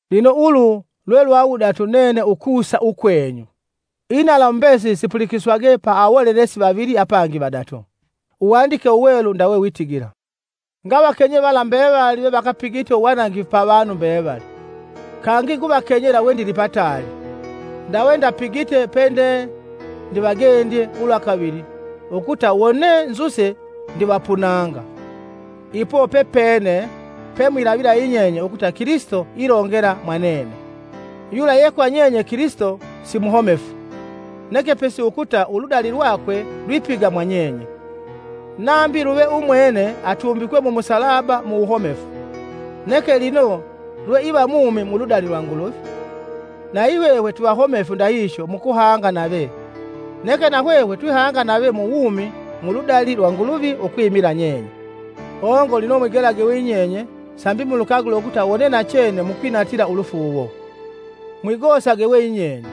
Lino ulu lwe lwa wudatu nene ukusa ukwenyu, “Inalamu mbesili sipulikiswage pa awolelesi vavili apangi vadatu.” Uwandike Uwelu ndawe witigila. Ngavakenye vala mbevali vevakapigite uwanangifu pavanu mbevali, kangi nguvakenye wendili pataali, ndawe ndapigite pende ndivagendye ulwa kavili ukuta wone nzuse ndivapunanga. Ipo pepene pemwilavila yinyenye ukuta Kilisito ilongela mwa nene. Yula ye kwa nyenye Kilisito si muhomefu, neke pesi ukuta uludali lwakwe lwipiga mwa nyenye. Nambi luve umwene atumbikwe mumusalaba muwuhomefu, neke lino lwe iva mumi muludali lwa Nguluvi. Nayi hwehwe twivahomefu ndahihyo mukuhanga nave, neke nahwehwe twihanga nave muwumi muludali lwa Nguluvi ukwimila nyenye. Ongo lino mwigelage we yinyenye sambi mulukagule ukuta wone nachene mukwinatila ulufuuwo. Mwigosage we yinyenye.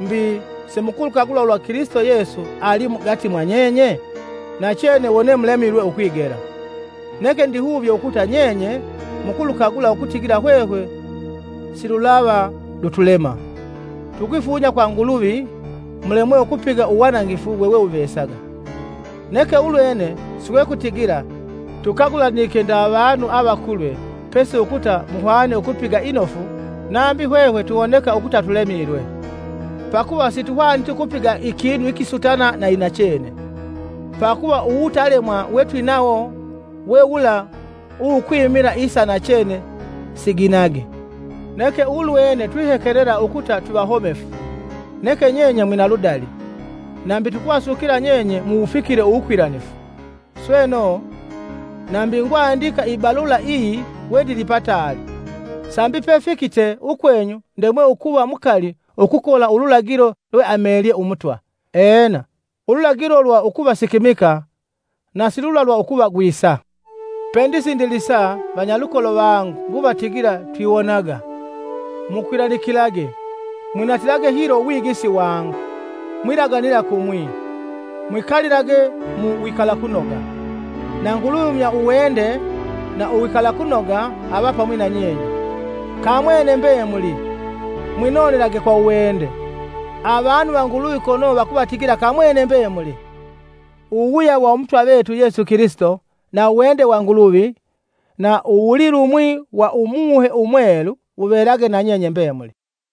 Mbi, simukulukagula ulwa Kilisito Yesu ali mugati mwa nyenye? Nachene wone mulemilwe ukwigela. Neke ndihuvye ukuta nyenye mukulukagula ukutigila hwehwe silulava lutulema. Tukwifunya kwa Nguluvi mulemwe ukupiga uwanangifu wewewuvesaga, neke ulwene si kwekutigila, tukagulanike nda vanu avakulwe pesi ukuta muhwane ukupiga inofu nambi hwehwe tuwoneka ukuta tulemilwe. Pakuva situhwaniti ukupiga ikinu ikisutana na inachene, pakuva uwutalemwa wetwinawo we wula uwukwimila isa nachene siginage. Neke ulwene twihekelela ukuta twivahomefu, neke nyenye mwina ludali, nambi tukuvasukila nyenye muwufikile uwukwilanifu. Sweno, nambi ngwandika ibalula iyi wendilipataali, sambi pefikite ukwenyu ndemwe ukuva mukali ukukola ululagilo lwe amelyee Umutwa, ena, ululagilo lwa ukuvasikimika na silula lwa ukuvagwisa. Pendisindilisa, vanyalukolo vangu nguvatigila twiwonaga! mukwilanikilage, mwinatilage hilo uwigisi wangu, mwilaganila kumwi, mwikalilage mu wikalakunoga. Na Nguluvi umunya uwende na uwikalakunoga ava pamwi na nyenye. Kamwene mbemuli, mwinonelage kwa uwende. Avanu va Nguluvi kono vakuvatigila kamwene mbemuli. Uwuwuya wa Umutwa vetu Yesu Kilisito na uwende wa Nguluvi na uwulilumwi wa Umuhe Umwelu, wuvelage nanyenye mbemuli.